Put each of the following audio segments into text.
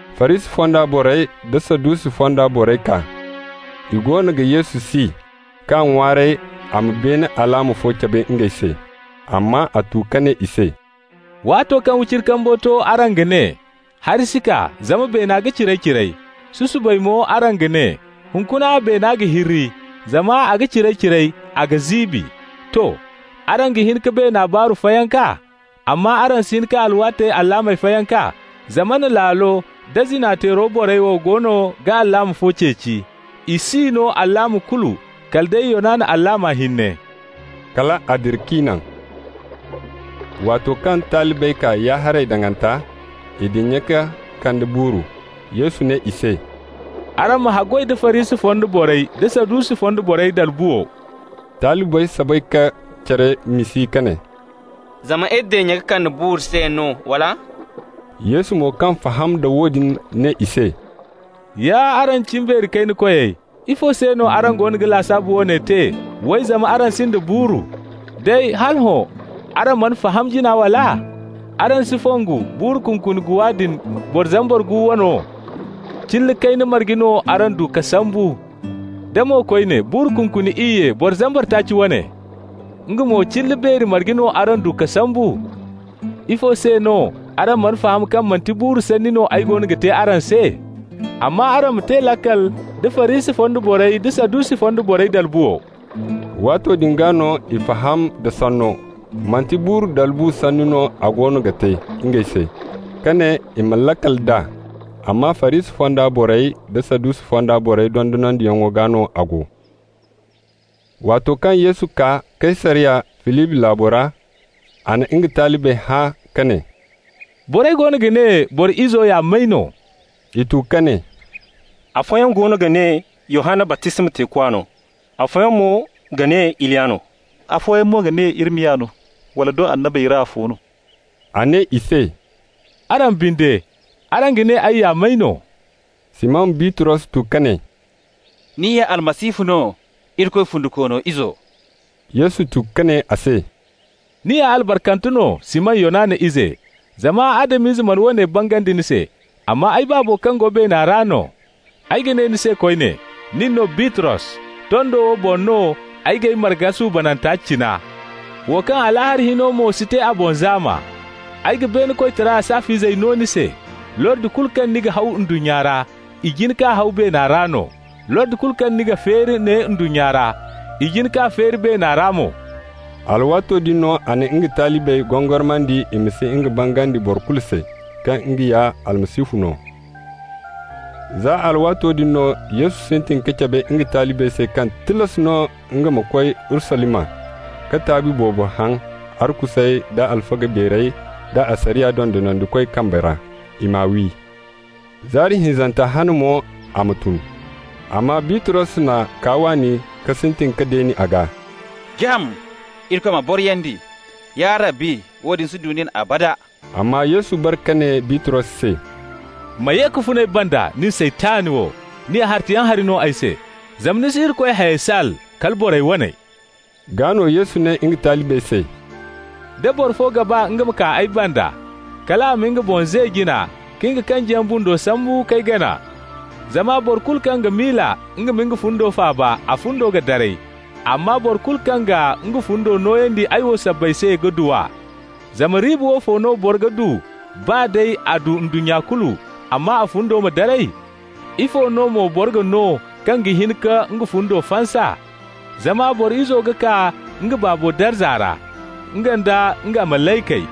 Farisi fonda borey da Sadusi fonda borey kaa. I goono ga Yesu si k'a ŋwaaray a ma beene alaama fo cabe ngey se. Amma a tu ka ne i se: «Waato kaŋ wiciri kambu to araŋ ga ne: ‹Hari si kaa, zama beena ga ciray-ciray.› Susubay mo araŋ ga ne: ‹Hunkuna beena ga hirri, zama a ga ciray-ciray, a ga ziibi.› To. Araŋ ga hin ka beena baaru fayanka, amma araŋ si hin ka alwaatey alaamey fayanka. Zamana laalo da zina-teero borey wo goono ga alaama fo ceeci. I s'i no alaama kulu kala day Yonana alaama hinne.» Kal a dira k'i naŋ. Waato kaŋ talibey kaa ya-haray daŋanta, i dinya ka kande buuru. Yesu ne i se: «Araŋ ma haggoy da Farisi fonda borey da Sadusi fonda borey dalbuwo.» Talibey soobay ka care miisi ka ne: «Zama iri dinya ka kande buuru se no, wala?» Yesu mo kaŋ faham da woodin ne i se: «Ya araŋ cimbeeri kayna koyey, ifo se no araŋ goono ga lasaabu woone te, way, zama araŋ sinda buuru? Day, hala hõ araŋ mana faham jina, wala? Araŋ si fongu buuru kunkuni guwa din boro zambar gu wano? Cilla kayna marge no araŋ du ka sambu? Da mo koyne, buuru kunkuni iyye boro zambar taaci wane? Nga mo, cilla beeri marge no araŋ du ka sambu? Ifo se no araŋ mana faham kaŋ manti buuru sanni no ay goono ga te araŋ se? Amma araŋ ma te laakal nda Farisi fonda borey da Sadusi fonda borey dalbuwo!» Waato din gaa no i faham d'a sanno, manti buuru dalbu sanni no a goono ga te ngey se, ka ne i ma laakal d'a, amma Farisi fonda borey da Sadusi fonda borey dondonandiyaŋo gaa no a go. Waato kaŋ Yesu kaa Kaysariya, Filibi laabo ra, a na nga talibey hã ka ne: «Borey goono ga ne Boro Izo ya may no?» I tu ka ne: «Afooyaŋ goono ga ne Yohanna baptisma teekwa no, afooyaŋ mo ga ne Iliya no, afooyaŋ mo ga ne Irimiya no, wala doŋ annabey ra afo no.» A ne i se: «Araŋ binde, araŋ ga ne ay ya may no?» Siman Bitros tu ka ne: «Ni ya Almasihu no, Irikoy fundikoono Izo.» Yesu tu ka ne a se: «Ni ya albarkante no, Siman Yonana ize, zama Adam-ize mana woone bangandi ni se, amma ay Baabo kaŋ go beena ra no. Ay ga ne ni se koyne: nin no Bitros. Tondo wo boŋ no ay g'ay marga suubananta cina, wo kaŋ Alaahara hino mo si te a boŋ zaama. Ay ga beene koytara saaf'izey no ni se. Lordi kulu kaŋ ni ga haw ndunnya ra, i jin k'a haw beena ra no. Lordi kulu kaŋ ni ga feeri ne ndunnya ra, i jin k'a feeri beena ra mo.» Alwaato din no a na nga talibey gongormandi i ma si nga bangandi boro kulu se, kaŋ nga ya Almasihu no. Za alwaato din no Yesu sintin ka cabe nga talibey se kaŋ tilas no nga ma koy Urusalima, ka taabi boobo haŋ arkusey da alfaga beerey da asariya dondonandikoy kambey ra, i m'a wi. Zaari hinzanta hane mo a ma tun. Amma Bitros n'a kaa waani ka sintin ka deen'a gaa: «Jam! Irikoy ma boriyandi, ya Rabbi! Woodin si du nin abada!» Amma Yesu bare ka ne Bitros se: «Ma ye ka fun ay banda, nin Saytan wo! Ni ya hartayaŋ hari no ay se, zama ni si Irikoy hayey saal, kala borey waney.» Gaa no Yesu ne nga talibey se: «Da boro fo ga baa nga ma kaa ay banda, kal a ma nga boŋ ze jina ka nga kanjiyaŋ bundo sambu k'ay gana. Zama boro kulu kaŋ ga miila nga ma nga fundo faaba, a fundo ga daray. Amma boro kulu kaŋ ga nga fundo nooyandi ay wo sabbay se ga du a. Zama riiba woofo no boro ga du baa day a du ndunnya kulu, amma a fundo ma daray? Ifo no mo boro ga no kaŋ ga hin ka nga fundo fansa? Zama Boro Izo ga kaa nga Baabo darza ra, nga nda nga malaykey.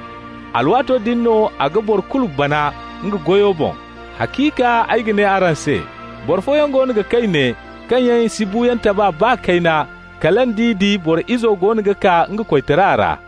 Alwaato din no a ga boro kulu bana nga goyo boŋ. Haciika, ay ga ne araŋ se, boro fooyaŋ goono ga kay ne kaŋ yaŋ si buuyaŋ taba baa kayna kala nd'i di Boro Izo goono ga kaa nga koytara ra.»